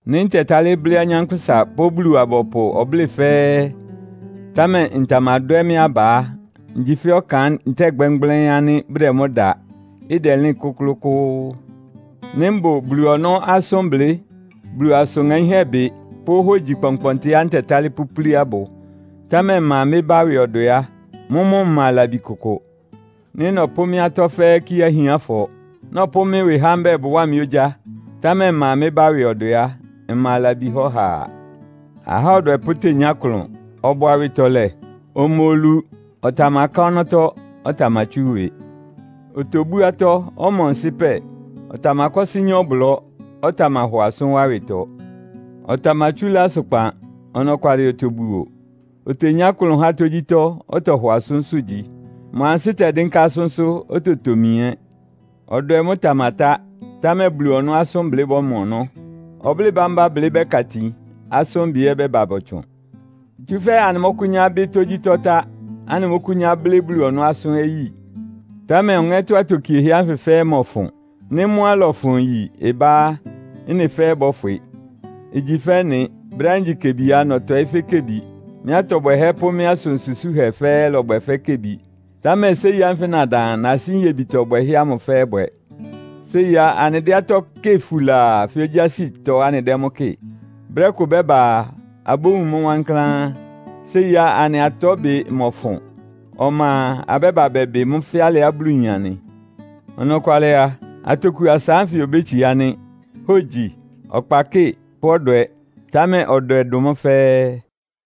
Nɩ́ ntɛtálɩ́ blɩ́ anyánkpʋ́sa pʋ́ Bulu-abɔpʋ ɔblɩ́ɩ fɛ́ɛ́, támɛ ntamadwɛ́ mɩ́ aba á, ngyi fɛ́ ɔkan ntɛ́ɛ gbɛ́mgblɛ́ɩ́n ánɩ́ bʋdɛ mʋ́ da, ɩdɛlɩ́n kʋ́klʋ́kʋ́ʋ́. Nɩ́ mbʋ Bulu ɔnɔ́ asʋ́nblɩ́, Bulu asʋn ŋaínhɛ́ bɩ pʋ́ hógyi kpɔnkpɔntɩá ntɛtálɩ́ pʋ́púlí abʋ, támɛ mma mɩ́ bá ɩwɩ ɔdwɛ á, mʋ́mʋ́ mma labi kʋkʋ. Nɩ́ nɔpʋ́ mɩ́ atɔ́ fɛ́ɛ́ kíé ahiánfɔ, nɔpʋ́ mɩ́ ɩwɩ há mbɛ́ɛ bʋwáa mɩ́ ogyá, támɛ mma mɩ́ bá ɩwɩ ɔdwɛ á, mma labi há ɔhaa. Ahá ɔdwɛpʋ́ tenyá ɩklʋn, ɔbʋ awɩtɔlɛ. Ɔma olu, ɔtamaká ɔnɔ́tɔ́, ɔtamatsú ɩwɩ. Otobú atɔ́, ɔma ɔnsɩ́pɛ. Ɔtamakɔ́sɩ́ nyá ɔblɔ́, ɔtamahɔ asʋ́n wá ɩwɩtɔ. Ɔtamatsúlá asʋkpan, ɔnɔkwalɩ otobuo. Otenyá klʋn há tógyítɔ́, ɔtɔhɔ asʋ́nsʋ́ gyi. Mʋ ansɩ́ tɛdɩ́nká asʋ́nsʋ́, ototomi ɛ́. Ɔdwɛ mʋ́ ɩtamatá, támɛ Bulu ɔnɔ́ asʋ́nblɩ́ bɔ́mɔ ɔnɔ́. Ɔblɩ́ɩ bámbá blɩ́ bɛ́ka itin, asʋ́nbɩ ɛ́ ɩbɛ́ba bɔtsʋn. Tsúfɛ́ anɩmɔ́kʋ́nyá bɩ́ tógyítɔ́ tá, anɩmɔ́kʋ́nyá blɩ́ Bulu ɔnɔ́ asʋ́n ɛ́ yi. Támɛ ɔŋɛ́tɔ́ atokiehɛ́ ánfɩ fɛ́ɛ́ ɩmɔfʋn. Nɩ́ mʋ́á ɩlɔfʋn yi ɩbá á, ɩ́nɩ fɛ́ɛ́ bɔ́fwɩ. Igyi fɛ́ ɩ́nɩ. Brɛ́á ngyi kebi á, nɔtɔɩ́ fɛ́ kebi. Mɩ́ atɔ bwɛhɛ́ pʋ́ mɩ́ asʋn susúhɛ fɛ́ɛ́ lɔbwɛ fɛ́ kebi. Támɛ séi ánfɩ nadan a, nasí nyebitɔ bwɛhɛ́ ámʋ fɛ́ɛ́ bwɛ. Séi á, anɩdɛ́ atɔ́ kɩ́ɩ fulaa fɛ́ ogyásitɔ anɩdɛ́ mʋ́ kɩ́ɩ. Brɛ́ ɩkʋ bɛ́ba a, abówun mʋ́ wankláán. Séi á, anɩ atɔ́bɩ mɔfʋn. Ɔma a, abɛ́ba bɛbɩ mʋ́ fɛ́ alɩá Bulu yin anɩ. Ɔnɔkwalɩ a, atoku asa ánfɩ obétsiá nɩ́. Hógyi, ɔkpakɩ́ɩ pʋ́ ɔdwɛ, támɛ ɔdwɛ dʋn mʋ́ fɛ́ɛ́.